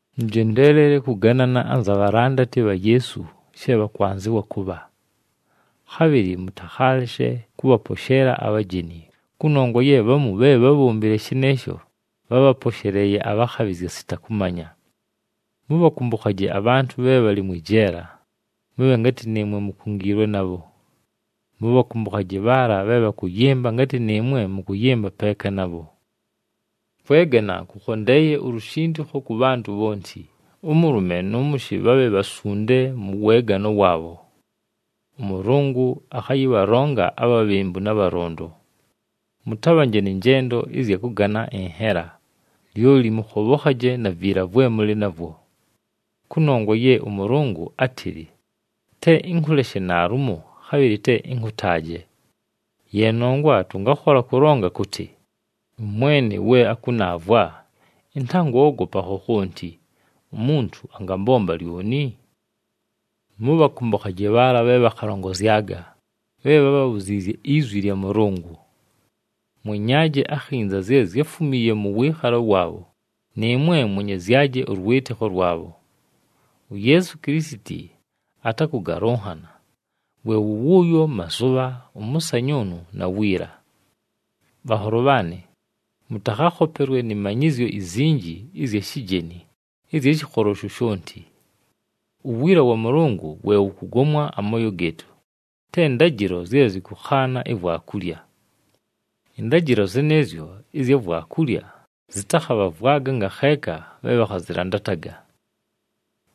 Mʉjendeelele kʉganana anza bhalandati bha Yeesu she bhakwanzɨwa kʉbha. Khabhɨlɨ mʉtakhaaleshe kʉbhaposheela abhajeni, kʉnongwa ye bhamu bhe bhábhombile shɨnɨɨsho, bhábhaposheleeye abhakhabhɨzya sita kʉmanya. Mʉbhakʉmbʉkhaje abhantʉ bhe bhalɨ mwɨ jeela, mʉbhe ngatɨ nɨɨmwe mukungiilwe nabho. Mʉbhakʉmbʉkhaje bhaala bhe bhakʉyɨmba ngatɨ nɨɨmwe mʉkʉyɨmba peeka nabho. Kwegana kʉkhondeeye ulushindikho kʉ bhantʉ bhonti, ʉmʉlʉme nʉ mʉshɨ bhabhe bhasunde mʉ weegano waabho. ɄMʉlʉngʉ akhayɨbhalonga abhabhembu na bhalondo. Mʉtabhanje nɨ njendo ɨzya kʉgana ɨnhela, lyoli mʉkhobhokhaje na viila vwe mʉlɨ navwo. Kʉnongwa ye ʉMʉlʉngʉ átɨlɨ, “Te ɨnkʉleshe naalumo, khabhɨlɨ te ɨnkʉtaaje.” Ye nongwa tʉngakhola kʉlonga kʉtɨ, “ɄMwene we akʉnaavwa, ɨntangoogopa khokhonti. Umuntu angambomba lyoni?” Mʉbhakʉmbʉkhaje bhaala bhe bhakhalongozyaga, bhe bhábhabhuziizye izwi lya Mʉlʉngʉ. Mwenyaaje akhinza zye zyáfumiiye mʉ wɨɨkhalo waabho, nɨɨmwe mwenyezyaje ʉlwɨtɨkho lwabho. UYeesu Kilisiti atakʉgalʉnhana, we wʉ wʉʉyo mazʉbha, ʉmʉsanyʉʉnʉ, na wiila. Bhanholo bhaanɨ, mʉtakhakhopelwe nɨ manyɨzyo izinji ɨzya shijeni ɨzya shɨkholo shoshonti. Uwiila wa Mʉlʉngʉ we wʉkʉgomwa amooyo gɨɨtʉ, te ndajɨlo zye zɨkʉkhaana ivwakulya. Ɨndajɨlo zɨnɨɨzyo ɨzya vwakulya zɨtakhabhavwaga ngakheeka bhe bhakhazɨlandataga.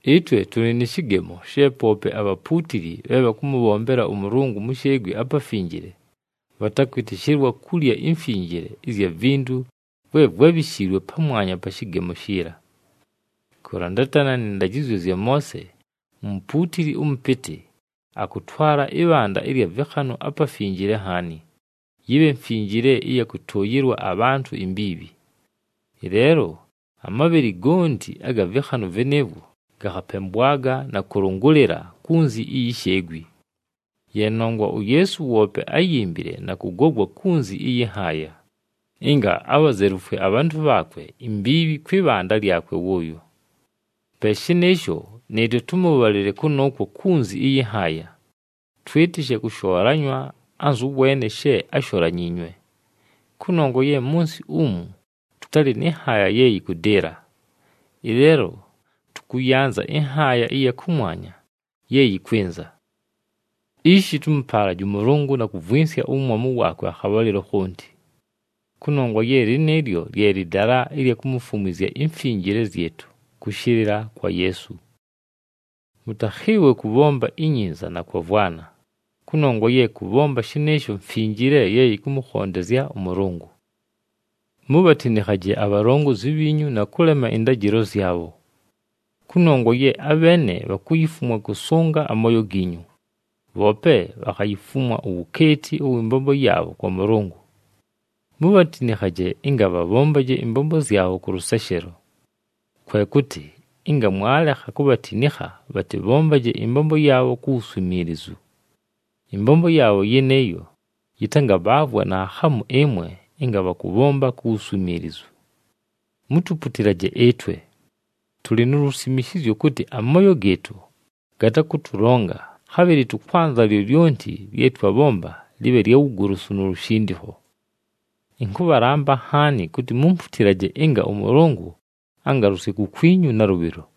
Ɨtwe tʉlɨ nɨ shɨgemo she poope abhapuutili bhe bhakʉmʉbhombela ʉMʉlʉngʉ mu sheegwi apafinjile, bhatakwɨtɨshɨlwa kulya imfinjile ɨzya vintu vwe vwábhishiilwe pamwanya pa shɨgemo shiila. Kʉlandatana nɨ ndajɨzyo zya Moose, umupuutili ʉmʉpɨtɨ akʉtwala ɨbhanda ɨlya vɨkhanʉ aPafinjile Nhaani, yɨbhe mfinjile ɨya kʉtʉʉyɨlwa abhantʉ imbiibhi. Ɨleelo amabhɨlɨ gonti aga vɨkhanʉ vɨnɨɨvwo gakhapembwaga na kʉlʉngʉlɨla kunzi iyi sheegwi. Ye nongwa uYeesu woope áyimbile na kʉgogwa kunzi ɨyɨ nhaaya, ɨnga abhazelufwe abhantʉ bhaakwe imbiibhi kwɨ bhanda lyakwe wʉʉyo. Pe shɨnɨɨsho, nɨɨtwe tʉmʉbhalɨle kʉnʉʉkwo kunzi ɨyɨ nhaaya, twɨtɨshe kʉshoolanywa anzʉ weene she ásholanyiinywe. Kʉnongwa ye mʉ nsɨ umu tʉtalɨ nɨ nhaaya ye yɨkʉdɨɨla, ɨleelo tʉkʉyanza ɨnhaaya ɨya kʉmwanya ye yɨkwɨnza. Ishi tʉmʉpaalaje ʉMʉlʉngʉ na kʉvwɨnsya uwumwamu waakwe akhabhalɨlo khonti. Kʉnongwa ye lɨnɨɨlyo lye lɨdala ɨlya kumufumwizya imfinjile zyɨtʉ kʉshɨlɨla kwa Yeesu. Mʉtakhɨɨwe kʉbhomba inyinza na kwavwana, kʉnongwa ye kʉbhomba shɨnɨɨsho mfinjile ye yɨkʉmʉkhondezya ʉMʉlʉngʉ. Mubhatinikhaje abhalongozi bhiinyu na kʉlema ɨndajɨlo zyabho. Kʉnongwa ye abheene bhakuyifumwa kʉsʉnga amooyo giinyu, bhoope bhakhayifumwa uwukeeti ʉwɨ mbombo yaabho kwa Mʉlʉngʉ. Mubhatinikhaje ɨnga bhabhombaje ɨmbombo zyabho kʉ lʉseshelo. Kwe kʉtɨ ɨnga mwalekha kubhatinikha bhatɨbhombaje ɨmbombo yaabho ku wuswimiilizu. Ɨmbombo yaabho yɨnɨɨyo yɨtangabhaavwa naakhamu ɨmwe ɨnga bhakʉbhomba ku wuswimiilizu. Mutuputilaje ɨtwe. Tʉlɨ nu lusimishizyo kʉtɨ amooyo gɨɨtʉ gatakʉtʉlonga, khabhɨlɨ tʉkwanza lyolyonti lye twabhomba lɨbhe lya wugolosu nu lushindikho. Ɨnkʉbhalamba nhaani kʉtɨ mumputilaje ɨnga ʉMʉlʉngʉ angalʉsye kukwinyu nalʉbhɨlo.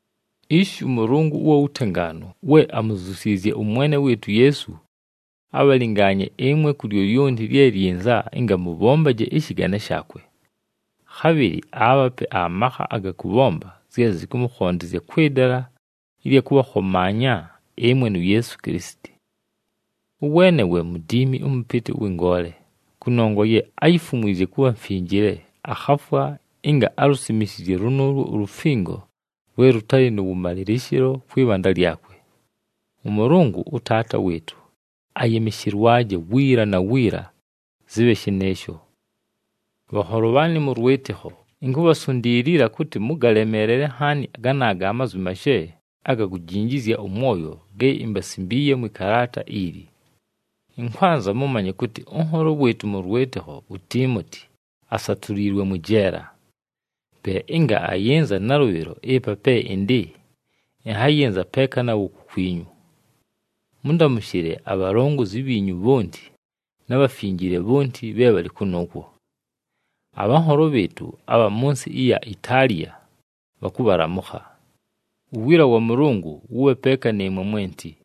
Ishi ʉMʉlʉngʉ ʉwa wutengaanu we amuzyusiizye ʉMwene wɨɨtʉ uYeesu, abhalɨngaanye ɨmwe ku lyolyonti lye lyinza ɨnga mʉbhombaje ɨshɨgane shaakwe. Khabhɨlɨ aabhape amakha aga kʉbhomba zye zɨkʉmʉkhondezya kwɨ dala ɨlya kʉbhakhomaanya ɨmwe nu Yeesu Kilisiti. Ʉweene we Mudiimi ʉMʉpɨtɨ ʉwɨ ngoole, kʉnongwa ye áyifumwizye kʉbha mfinjile, akhafwa ɨnga alusimishizye lʉnʉʉlwo ulufingo lwe lʉtalɨ nʉ wʉmalɨlɨshɨlo kwɨ bhanda lyakwe. ɄMʉlʉngʉ, ʉTaata wɨɨtʉ, ayɨmɨshɨlwaje, wiila na wiila! Zɨbhe shɨnɨɨsho. Bhanholo bhaanɨ mʉ lwɨtɨkho, inkubhasundiilila kʉtɨ mʉgalemeelele nhaani ganaaga amazwi mashe aga kujinjizya ʉmwoyo ge imbasimbiiye mwɨ kalaata ili. Ɨnkwanza mʉmanye kʉtɨ ʉnholo wɨɨtʉ mʉ lwɨtɨkho uTiimoti asatuliilwe mwɨ jeela. Pe ɨnga ayɨnza nalʉbhɨlo ɨpa pe ɨndɨ, ɨnhayɨnza peeka nawo kukwinyu. Mʉndamʉshɨle abhalongozi bhiinyu bhonti na bhafinjile bhonti bhe bhalɨ kʉnʉʉkwo. Abhanholo bhɨɨtʉ abha mʉ nsɨ ɨya Itaaliya bhakʉbhalamʉkha. Uwiila wa Mʉlʉngʉ wʉbhe peeka nɨɨmwe mwenti.